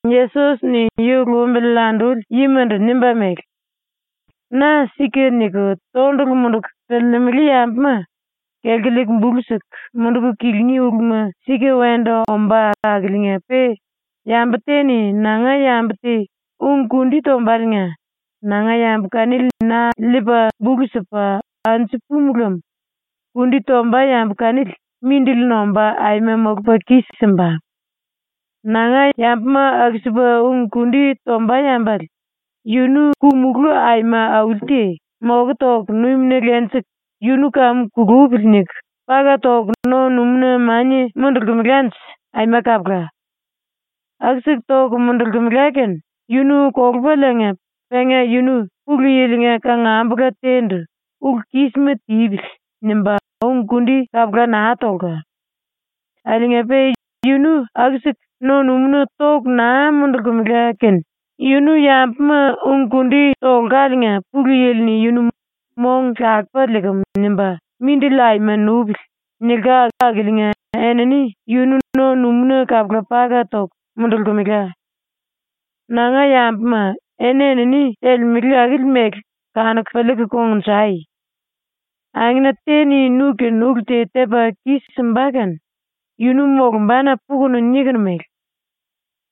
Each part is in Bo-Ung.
Yesos-ni yu lumbili anduli yimandu nimba mele: “⸤Na⸥ ‘Sika’ niku tondulu munduku piliilimili yambuma kelku liiku bulu siku munduku kilingí uluma sika wendu ombá akiliinga-pe yambu te-ni nanga yambu te ung-kundi tombaliinga nanga yambu kanili na liipa bulu sipa anju pumu lem kundi tomba yambu kanili mindili nomba aima molupa kis-simba. Nanga yambuma aku-sipa ung-kundi tomba yambale yunu ku- mulú aima auli te moku toku numina lenjiku ‘Yunu kamu kulúpili.’ niku paka toku no-numúna mania mundulkemelanje aima kapula. Aku-siku toku mundulkemela kene yunu kolupaliinga penga yunu Pulu Yili-nga kangambula te-ndu ‘Ulu-kísima tipili.’ nimba ung-kundi kapula naa tolka. Akiliinga-pe yunu aku-siku no-numúna toku naa mundulkemela kene yunu yambuma ung-kundi tolkaliinga Pulu Yili-ni yunu ‘Mong lakupa liikim.’ nimba “Mindili aima nupili.” nilka akiliinga enini yunu no-numúna kapula paka toku mundulkemela. “Nanga yambuma, eni-enini telemele akili mele kanuku piliiku kongnjai. “Angena te-ni nu-kene ulu te tepa kis-simba kene yunu molumbana pukunu nikunu mele: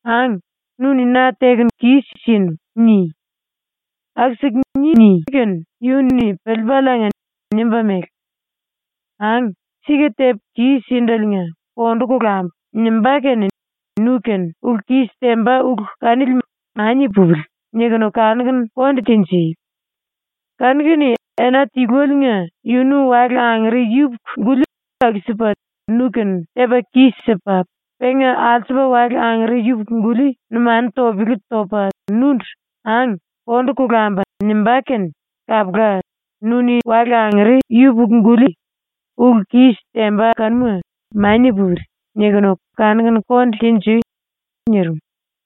“Ang, nu-ni na tekunu kis-sinu.” ni. Aku-siku niní kene yunu-ni piliipaliinga nimba mele: “Ang, sika tepu kis-sindeliinga kondu kolambu.” nimbá kene nu-kene ulu-kis temba ulu kanili ‘Mania pupili.’ nikunu kanuku konde tenjui. Kanu-kene ena tilueliinga yunu wale angere yupuku-guli aku-sipa nu-kene tepa kis-sipa, penga alsupa wale angere yupuku-guli numanu topele topa nundu “Ang, kondu kolambu.” nimbá kene kapula, nu-ni wale angere yupuku-guli ulu-kis temba kanuma ‘Mania pupili.’ nikunu kanuku konde tenjui.” nirim.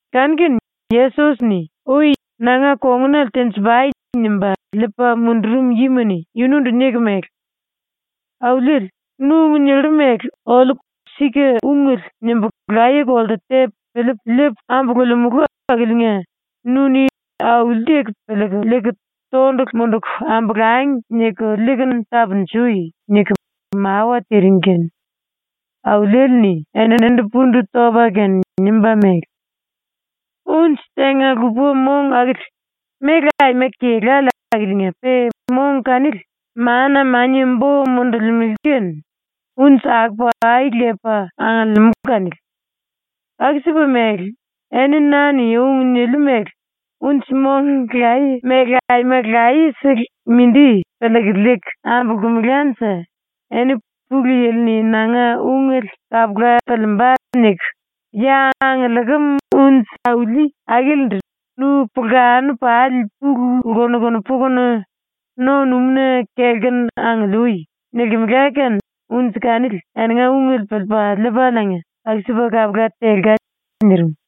Kanu-kene Yesos-ni ui “Nanga kongunale tenji-pai.” nimba liipa mundurum yima-ni yunundu niku mele: “Auliele, nu ung nillu mele oliu ‘Sika ungele.’ nimbu laye-kolte tepu piliipu liipu ambululimulu akiliinga nu-ni ‘auli-teku piliiku liiku tondulu munduku ambolangi.’ niku liikunu tapunjui.” niku mawa tiring kene ⸤Auliele-ni⸥ eninindu pundu topa kene nimba mele: “Unji tenga-lupa mong akili méle aima kelále akiliinga-pe mong kanili mana mania bo mundulimele kene unji akopa ai lepa angiliimú kanili. Aku-sipa mele, eni na-ni ung niliu mele unji-mong laye mele aima laye-sele mindi piliiku liiku ambulkumelanje, eni ‘Pulu Yili-ni nanga ungele kapula piliimba.’ niku ya angiliikim unji auli akilindu “Nu pulkanu pali pulu lkunuku pukunu, no-numúna kelku angiliui.” nilkimela kene unji kanili eninga ungele piliipa liipaliinga aku-sipa kapula telka.” ⸤nirim.⸥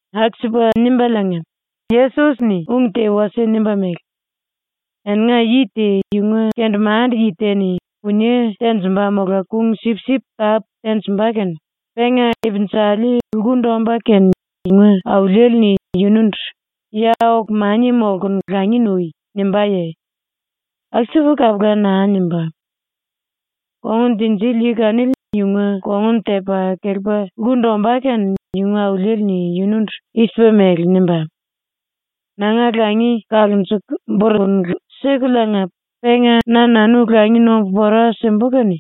⸤Aku-sipa nimbaliinga ung te wasie nimba mele:⸥ “Eninga yi te yunga kendemande-yi te-ni punie tenjimba mola kung-sipsip tápu tenjimba kene penga ipinjali lkundu ombá kene yunga auliele-ni yunundu “Ya oku mania molkunu langi nui.” nimbáye? ⸤Aku-sipa kapula naa nimbá.⸥ Kongun tinjili yi kanili yunga kongun tepa kelepa lkundu ombá kene yunga auliele-ni yunundu i-sipa mele nimbá: “Nanga langi kalunjuku burukunu sikuliinga penga na-nanu langi nombu pora simbu kene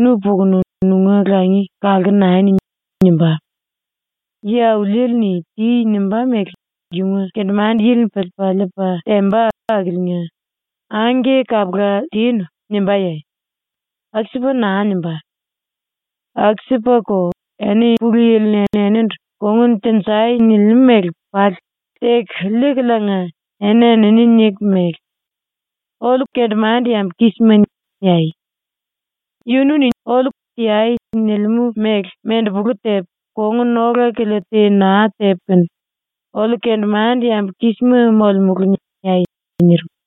nu pukunu nunga langi kalku nani.” nimbá. Yi-auliele-ni ‘Ti.’ nimbá mele yunga kendemande-yili-ni piliipa liipa temba akiliinga “Angke, kapula tinu.” nimbáye? Aku-sipa naa nimbá. “Aku-sipako, eni Pulu Yili-ni enindu “Kongun tenjai.” nilimú mele pali teku liikuliinga eni-enini niku mele: ‘Oliu kendemande-yambu kísima.’ niai. ‘Yunu-ni oliu “Teai.” nilimú mele mendepulu tepu, kongun ola-kilia te naa tepu kene oliu kendemande-yambu kísima molemulu.’ niai.” nirim.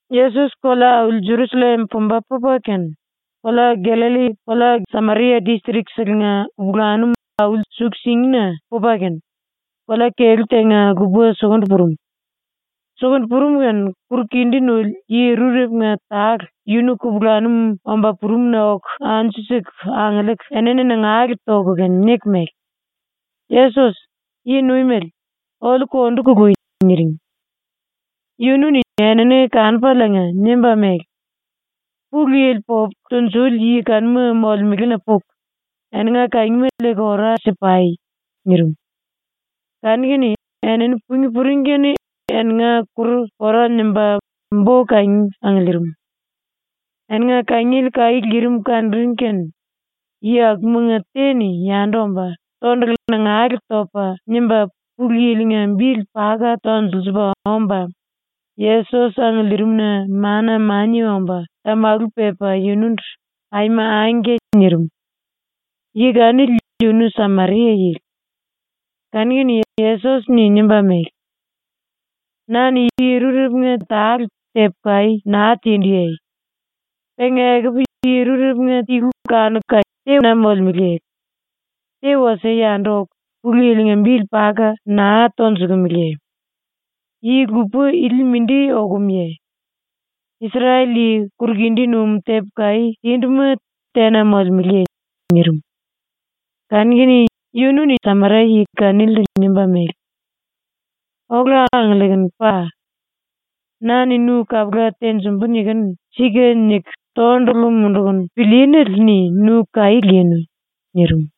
Yesos kolea-auli Jerusallem pumba pupa kene, kolea Gallalli kolea Sameria distrik-selenga kupulanum ai-suku-singina pupa kene, kolea kelú tenga-lupa sukundu purum. Sukundu purum kene kuru-kindí nuli yi rurepunga tale yunu kupulanum omba purumna oku anju-siku angiliiku enini nangale toku kene niku mele: “Yesos, Yi-Nuimele, oliu kondu kului.” niring. Yunu-ni enini kanupaliinga nimba mele: “Pulu Yili popu tunjuli yi kanuma molemelena puku, eninga kangima liiku ora si-pai.” nirim. Kanu-kene enini pungí puring kene eninga kuru pora nimba bo-kangi angiliirim. Eninga kangiele kaí lirim kanuring kene yi akumanga te-ni yandu omba tondulu nangale topa nimba Pulu Yili-nga bili paka tonjiliipa omba Yesos angiliirimna mana mania omba tamalu pepa yunundu “Aima angke.” nirim. Yi kanili yunu Sameria-yili. Kanu-kene Yesos-ni nimba mele: “Na-ni yi rurepunga tale tepu kaí naa tinduye? Penga ekupu yi rurepunga tilu kanuka tena molemeleye? Te wasie yandu oku Pulu Yili-nga bili paka naa tonjukumiliye? Yi-lupa ili mindi okumuye? Isrel-yi kuru-kindí num tepu kaí tinduma tena molemeleye?” nirim. Kanu-kene yunu-ni Sameria-yi kanilindu nimba mele: “Ola angiliikunu pa. Na-ni nu kapula tenjimbu nikunu “Sika” niku tondulu mundukunu pilíínele-ni nu kaí linu.” nirim.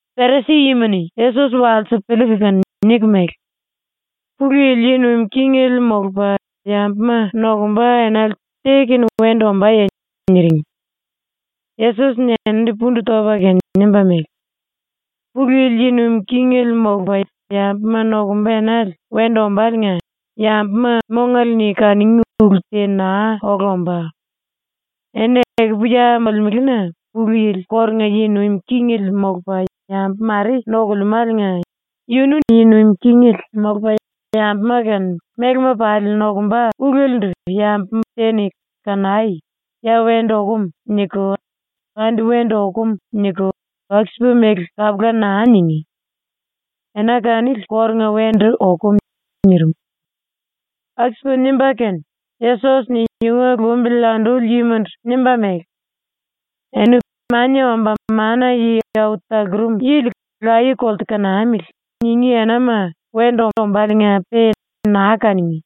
Perisi-yima-ni Yesos walsiku piliiku kene niku mele: “Pulu Yili yi nuim kingele molupa yambuma nokumba enale te-kene wendu ombáye?” niring. Yesos-ni eninindu pundu topa kene nimba mele: “Pulu Yili yi nuim kingele molupa yambuma nokumba enale wendu ombáliinga yambuma mongale-ni kanungí ulu te naa ola ombá. Eni ekupu ya molemelena Pulu Yili kórunga yi nuim kingele molupa yambu mare nokulemáliinga yunu yi nuim kingele molupa yambuma kene mélema pali nokumba ulelendu yambu te-ni “Kanai. Ya wendu okum.” niku, “Andi wendu okum.” niku, aku-sipa mele kapula naa ningí. Ena kanili kórunga wendu okum.” nirim. Aku-sipa nimba kene Yesos-ni yunga lumbili anduli yimandu nimba mele: “Eni “Mania Omba Mana-Yi Au Talurum Yili laye-kolte kanamili.” ningí enama wendu ombáliinga-pe naa kanungí.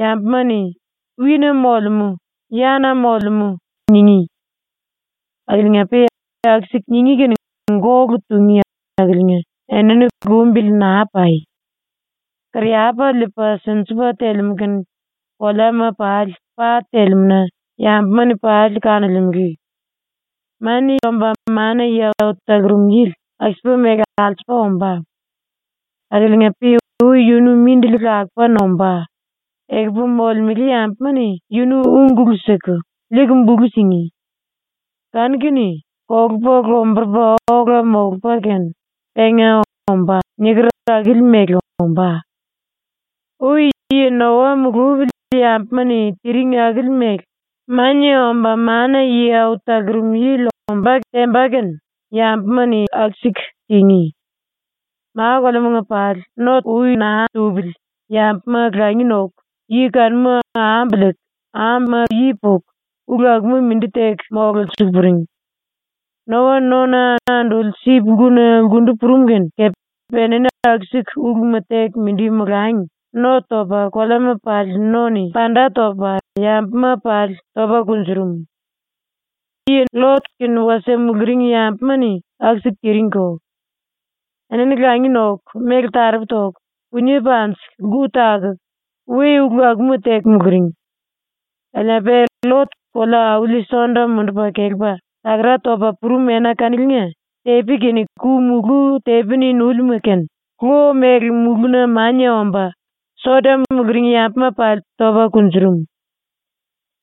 Yambuma-ni “Wi-na molemú.”, “Ya-na molemú.”, ningí. Akiliinga-pe aku-siku ningí kene gólu tungí akiliinga enini lumbili naa pai. Kariyapa liipa sinjipa telemú kene koleama pali pa telemú-na yambuma-ni pali kanolemele. Mania Omba Mana-Yi Au Talurum Yili aku-sipa mele alsupa ombá. Akiliinga-pe ui yunu mindili lakupa nombá, ekupu molemele yambuma-ni yunu úngulu siku, liiku bulu singí. ⸤Kanu-kene kolupa lomburupa ola molupa kene,⸥ penga “Ombá.” niker akili mele ombá. “Ui yi Noa mulupili yambuma-ni tiring akili mele Mania Omba Mana-Yi Au Talurum Yili ombá temba kene yambuma-ni aku-siku tingí. ⸤Ma-koleamanga pali⸥ no ui naa tupili yambuma langi noku, yi kanuma ambu liiku, ambuma yi puku, ulu akuma mindi teku mololsiliiku puring. Noa nona anduli sip-lkuna lkundu purum kene kepe enini aku-siku uluma teku mindi molangi no topa ⸤koleama pali no-ni panda topa⸥ yambuma pali topa kunjurum. “LLot kene wasie muluring yambuma-ni aku-siku tiringko. Enini langi noku, méle taropu toku, punie panjiku, lku takuku, we-ulu akuma teku muluring. Akiliinga-pe LLot kolea-auli Sodom mundupa kelepa takara topa purum ena kaniliinga tepi kene ku-mulú tepi-ni núlima kene lo mele mulúna mania omba Sodom muluring yambuma pali topa kunjurum.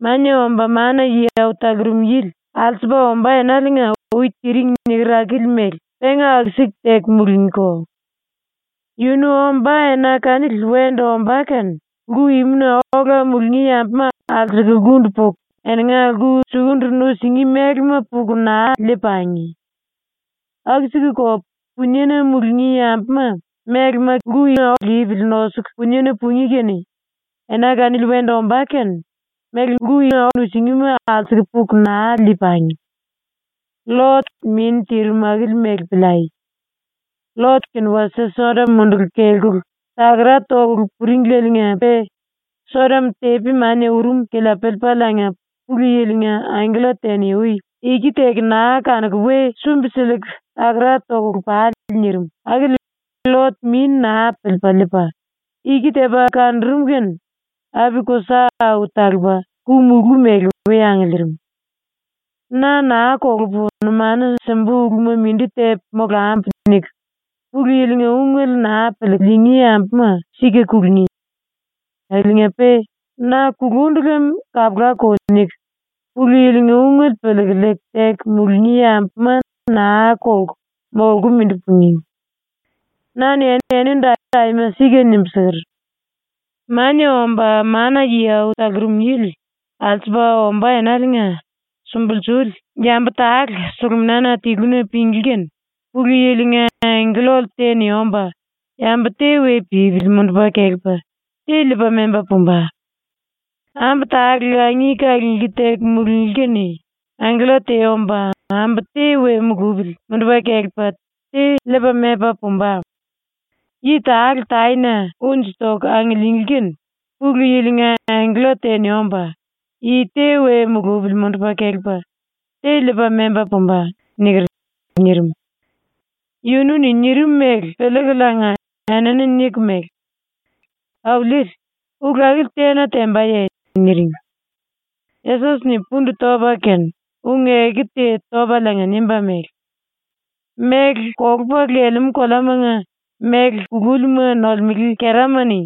“Mania Omba Mana-Yi Au Talurum Yili alsupa ombá enaliinga ui tiring niker akili mele penga aku-siku teku mulungíko. “Yunu ombá ena kanili wendu ombá kene lku imuna ola mulungí yambuma alsuku lkundu puku eninga lku sukundu nusingí mélema puku naa lii-pangi. Aku-sikuko puniena mulungí yambuma mélema lipili nosuku puniena pungí kene ena kanili wendu ombá kene méle nusingíma alsuku puku naa lii-pangi. LLot-min tirim akili mele piliai. ⸤LLot kene wasie Sodom munduku kelkulu takara tokulu puringleliinga-pe Sodom tepi mania urum kilia piliipaliinga Pulu Yili-nga angkella te-ni ui “Iki teku naa kanukulu we sumbi-sikulu takara tokulu pale.” nirim akili LLot-min naa piliipa liipa, iki tepa kanurum kene api-kusa au talupa ku-mulú mele we angiliirim.⸥ “‘Na naa kolupu numanu simbu uluma mindi tepu molambu.’ niku Pulu Yili-nga ungele naa piliiku liingí yambuma sika kulungí. Akiliinga-pe ‘Na kulundu lem kapulako.’ niku Pulu Yili-nga ungele piliiku liiku teku mulungí yambuma naa kolku molku mindi pungí. “Na-ni enindu aima sika nimbu siker: “Mania Omba Mana-Yi Au Talurum Yili alsupa ombá enaliinga sumbulsuli yambu tale sulumina tiluna pinglí kene ⸤Pulu Yili-nga angkella te-ni⸥ omba yambu te we pípili mundupa kelepa te liipa memba pumba. Ambu tale langi kalunglí teku mulunglí kene ⸤angkella te omba⸥ ambu te we mulupili mundupa kelepa te liipa memba pumba. (Yi tale taena unji toku angiliinglí kene ⸤Pulu Yili-nga angkella te-ni omba⸥ yi te we mulupili mundupa kelepa te liipa memba pumba.)” niker.” nirim. ⸤Yunu-ni nirim mele piliikuliinga⸥ enini niku mele: “Auliele, ulu akili tena tembaye?” niring. Yesos-ni pundu topa kene ung-eku te topaliinga nimba mele: “Méle kolupa lelemú koleamanga méle kulúlima nolemele kerama-ni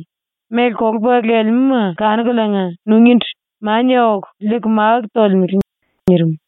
méle kolupa lelemúma kanukuliinga nungíndu mania oku liiku máku tolemele.” nirim.